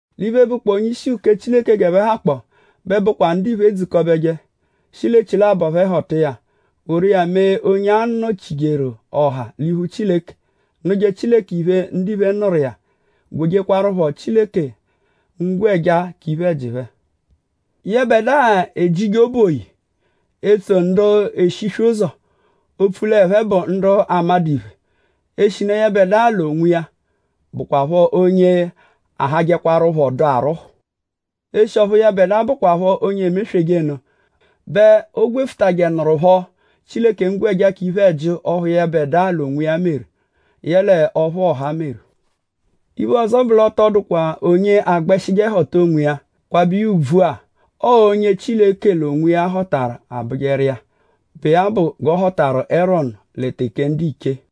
L'iphe, bụkpoo onye-ishi uke Chileke g'ẹphe hakpọo bẹ bụkwa ndiphe edzukọbeje shi l'echilabọ phẹ họta iya woru iya mee onye a-nọ-chijeru ọha l'iphu Chileke; nụje Chileke iphe, ndiphe nụru iya; gwejekwarụpho Chileke ngwẹja k'iphe-ẹji phẹ. Yẹbedua ejije obu oyi; etso ndu eshiswe ụzo; opfu l'ẹphe bụ ndu amadụ iphe; eshinu yẹbedua l'onwiya bụkwapho onye ahajẹkwarupho dụ arwụhu. Eshi ọphu yẹbedua bụkwapho onye emesweje nụ bẹ o gwefutajẹnurupho Chileke ngwẹja k'iphe-ẹji ọphu yẹbedua l'onwiya meru; yẹle ọphu ọha meru. Iphe ọzo bụ; l'ọ tọ dụkwa onye agbẹshije họta onwiya kwabẹ ùbvù-a. Ọo onye Chileke l'onwiya họtaru abụjeru iya, bụ iya bụ g'ọ họtaru Erọnu lẹ teke ndiche.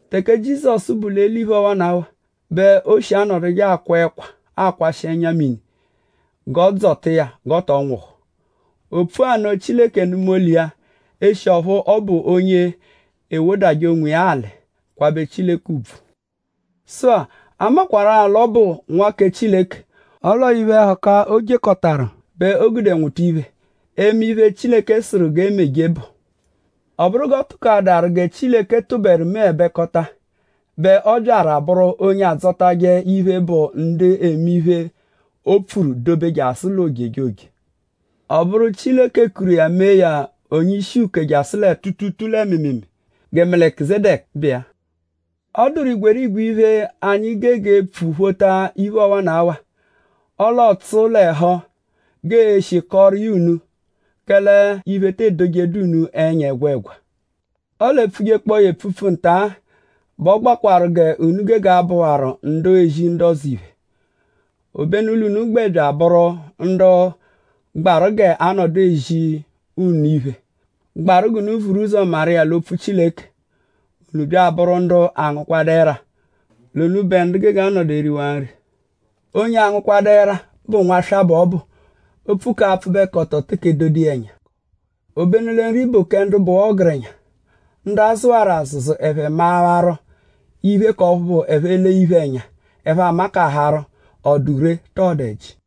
Teke Jizọsu bu l'eliphe ọwanawa bẹ o shi anọduje akwa ẹkwa akwashị ẹnya-mini g'ọo-dzọta iya g'ọ tọ nwụhu. O pfua nno; Chileke nụma olu iya; eshi ọphu ọ bụ onye ewodajẹ onwiya alị kwabẹ Chileke ùbvù. Sụ-a; a makwarụ-a l'ọ bụ Nwa kẹ Chileke; ọle ọo iphe-ẹhuka, o jekọtaru bẹ o gude nwụta iphe, eme iphe, Chileke sụru g'e meje bụ. Ọ bụru g'ọ tụkoadaru gẹ Chileke tụberu meẹbekota bẹ ọ byaru abụru onye adzọtaje iphe, bụ ndu eme iphe, o pfuru; dobe jasụ l'ojejoje. Ọ bụru Chileke kuru iya mee ya onye-ishi-uke jasụ lẹ tuutuutuu lẹ mịimiimii gẹ Melikizedeku bụ iya. Ọ dụru igwerigwe iphe, anyi gege epfu phota iphe ọwanawa; ọle ọotsu l'ẹhu g'ee-shi kọoru iya unu; kẹle iphe te edojeẹdu unu ẹnya ẹgwegwa. Ọle e -pfujekpọo ya epfupfu nta-a bẹ ọ gbaakwaru g'unu gege abụwaru ndu ezi ndu ọzo iphe; obenu l'unu gbẹ bya abụru ndu gbaru g'aa-nọdu ezi unu iphe, gbaru g'unu vuru ụzo maru iya l'opfu Chileke. Unu bya abụru ndu angụkwadu ẹra; l'unubẹ ndu gege anọdu eriwaa nri. Onye angụkwadu ẹra bụ nwaswa bẹ ọ bụ. Opfu k'apfụbekoto teke edodu iya ẹnya. Obenu lẹ nri bụ kẹ ndu bụwaa ọgerenya; ndu a zụwaru azụzu ẹphe mawaru iphe k'ọphu bụ: ẹphe -lee iphe ẹnya; ẹphe a-makaharụ?ọ dụ ree tọ ọ dụ ẹji.